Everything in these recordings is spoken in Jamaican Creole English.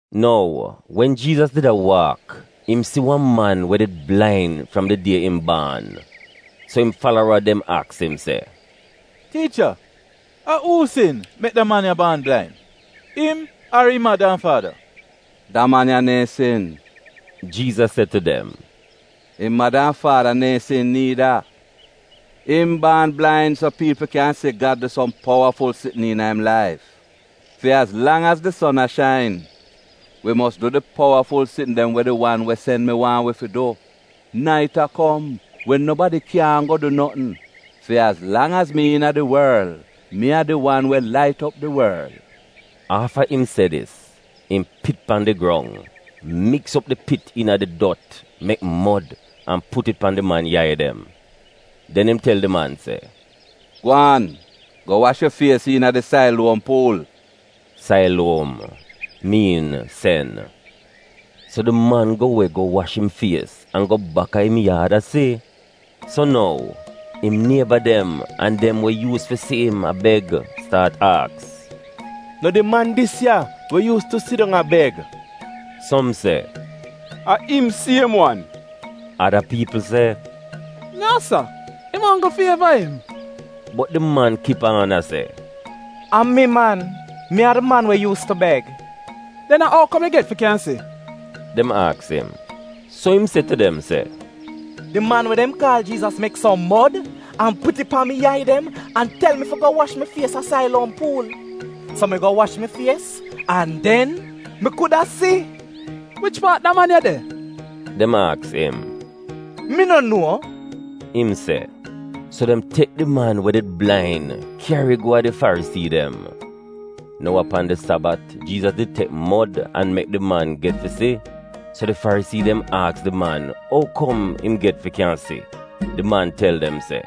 Nou, wen Jiizas did a waak, im si wan man we did blain fram di die im baan. So im falara dem aks im se, “Tiicha, a uu sin mek da man ya baan blain, im ar im mada an faada?” “Da man ya neehn sin,” Jiizas se tu dem, “Im mada an faada neehn sin niida. Im baan blain so piipl kyan si Gad du som powaful sitn iina im laif. Fi az lang az di son a shain, wi mos du di powaful sitn dem we di wan we sen mi waahn wi fi du. Nait a kom, wen nobadi kyaahn go du notn. Fi az lang az mi iina di worl, mi a di wan we lait op di worl.” Afta im se dis, im pit pan di grong, miks op di pit iina di dot mek mod an put it pan di man yai dem. Den im tel di man se, “Gwaan go wash yu fies iina di Sailuom Puul” (Sailuom miin Sen.) So di man go we go wash im fies an go baka im yaad a si! So nou, im nieba dem an dem we yuuz fi si im a beg staat aks, “No di man dis ya we yuus tu sidong a beg?” Som se, “A im siem wan.” Ada piipl se, “No sa, im onggl fieva im.” Bot di man kip aan se, “A mi man. Mi a di man we yuus tu beg.” “Den a ou kom yu get fi kyan si?” dem aks im. So im se tu dem se, “Di man we dem kaal Jiizas mek som mod an put it pan mi yai dem an tel mi fi go wash mi fies a Sailuom Puul. So mi go wash mi fies, an den mi kuda si.” “Wich paat da man ya de?” dem aks im. “Mi no nuo,” im se. So dem tek di man we did blain kyari go a di Farisii dem. (Nou a pan di Sabat Jiizas did tek mod an mek di man get fi si.) So di Farisii dem aks di man ou kom im get fi kyan si. Di man tel dem se,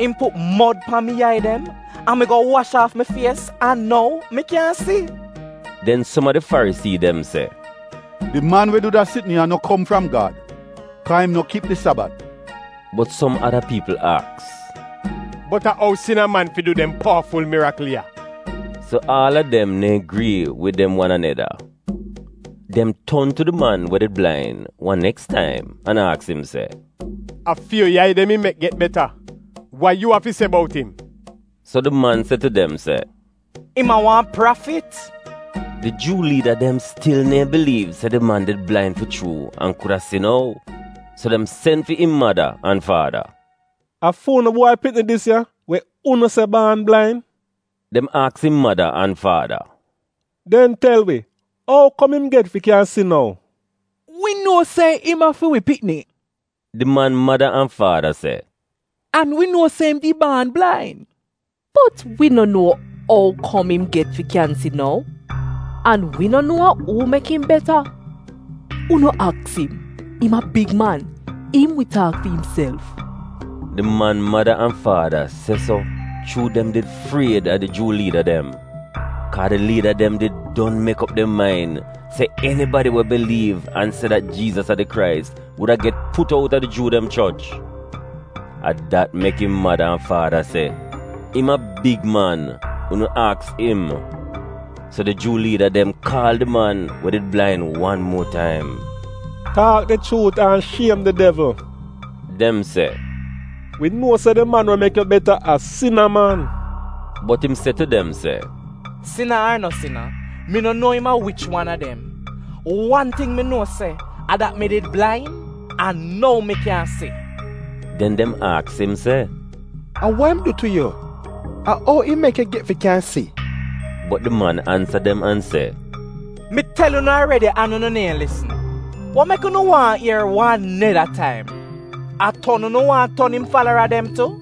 “Im put mod pan mi yai dem, an mi go wash aaf mi fies an nou mi kyan si.” Den som a di Farisii dem se, “Di man we du da sitn ya no kom fram Gad, kaa im no kip di Sabat.” Bot som ada piipl aks, “Bot a ou sina man fi du dem powaful mirikl ya?” So aal a dem neehn grii wid dem wan aneda. Dem ton tu di man we did blain wan neks taim an aks im se, “A fi yu yai dem im mek get beta. Wa yu afi se bout im?” So di man se tu dem se, “Im a wan prafit.” Di Juu liida dem stil neehn biliiv se di man did blain fi chuu an kuda si nou, so dem sen fi im mada an faada. “A fu'unu bwai pikni dis ya, we unu se baan blain?” dem aks im mada an faada. “Den tel wi ou kom im get fi kyan si nou?” “Wi nuo se im a fi wi pikni,” di man mada an faada se, “an wi nuo se im did baan blain. Bot wi no nuo ou kom im get fi kyan si nou, an wi no nuo a uu mek im beta. Unu aks im. Im a big man. Im wi taak fi imself.” (Di man mada an faada se so chuu dem did fried a di Juu liida dem, kaa di liida dem did don mek op dem main se enibadi we biliiv an se dat Jiizas a di Krais wuda get put outa di Juu dem choch. A dat mek im mada an faada se, “Im a big man. Unu aks im.”) So di Juu liida dem kaal di man we did blain wan muo taim. “Taak di chuut an shiem di devl,” dem se. “Wi nuo se di man we mek yu get beta a sina man.” Bot im se tu dem se, “Sina ar no sina, mi no nuo im a wich wan a dem. Wan ting mi nuo se a dat mi did blain, an nou mi kyan si!” Den dem aks im se, “A wa im du tu yu? A ou im mek yu get fi kyan si?” Bot di man ansa dem an se, “Mi tel unu aredi an unu neehn lisn. Wa mek unu waahn ier wan neda taim? A ton unu wan ton im falara dem tu?”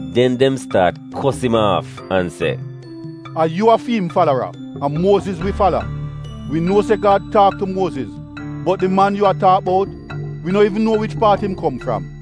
Den dem staat kos im aaf an se, “A yu a fi'im falara! A Muoziz wi fala! Wi nuo se Gad taak tu Muoziz, bot di man yu a taak bout, wi no iivn nuo wich paat im kom fram.”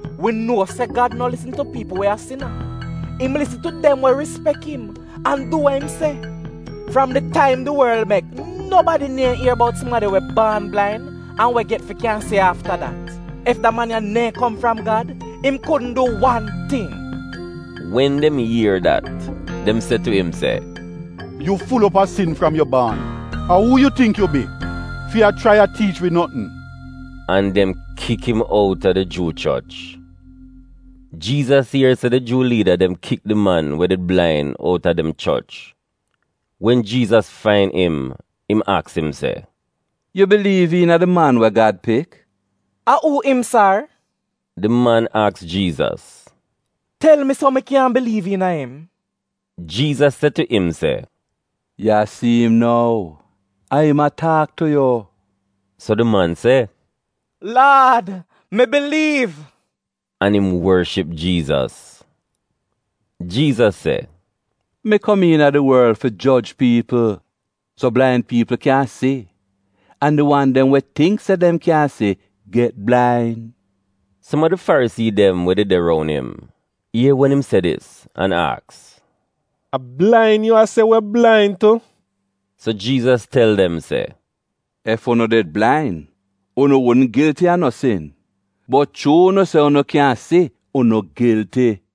Wi nuo se Gad no lisn tu piipl we a sina. Im lisn tu dem we rispek im, an du we im se. Fram di taim di worl mek nobadi neehn ier bout sumadi we baan blain an we get fi kyan si afta dat. Ef da man ya neehn kom fram Gad, im kudn du wan ting.” Wen dem ier dat, dem se tu im se, “Yu ful op a sin fram yu baan. A uu yu tingk yu bi fi a chrai a tiich wi notn?” An dem kik im outa di Juu choch. Jiizas ier se di Juu liida dem kik di man we did blain out a dem choch. Wen Jiizas fain im, im aks im se, “Yu biliiv iina di Man we Gad Pik? “A uu im, sar?” di man aks Jiizas. “Tel mi so mi kyan biliiv iina im.” Jiizas se tu im se, “Yu a si im nou. A im a taak tu yu.” So di man se, “Laad, mi biliiv,” an im worship Jiizas. Jiizas se, “Mi kom iina di worl fi joj piipl, so blain piipl kyan si an di wan dem we tingk se dem kyan si get blain.” Som a di Farisii dem we did de roun im ier wen im se dis an aks, “A blain yu a se wi blain tu?” So Jiizas tel dem se, “Ef unu did blain, unu wudn gilti a no sin, bot chuu unu se unu kyan si, unu gilti.”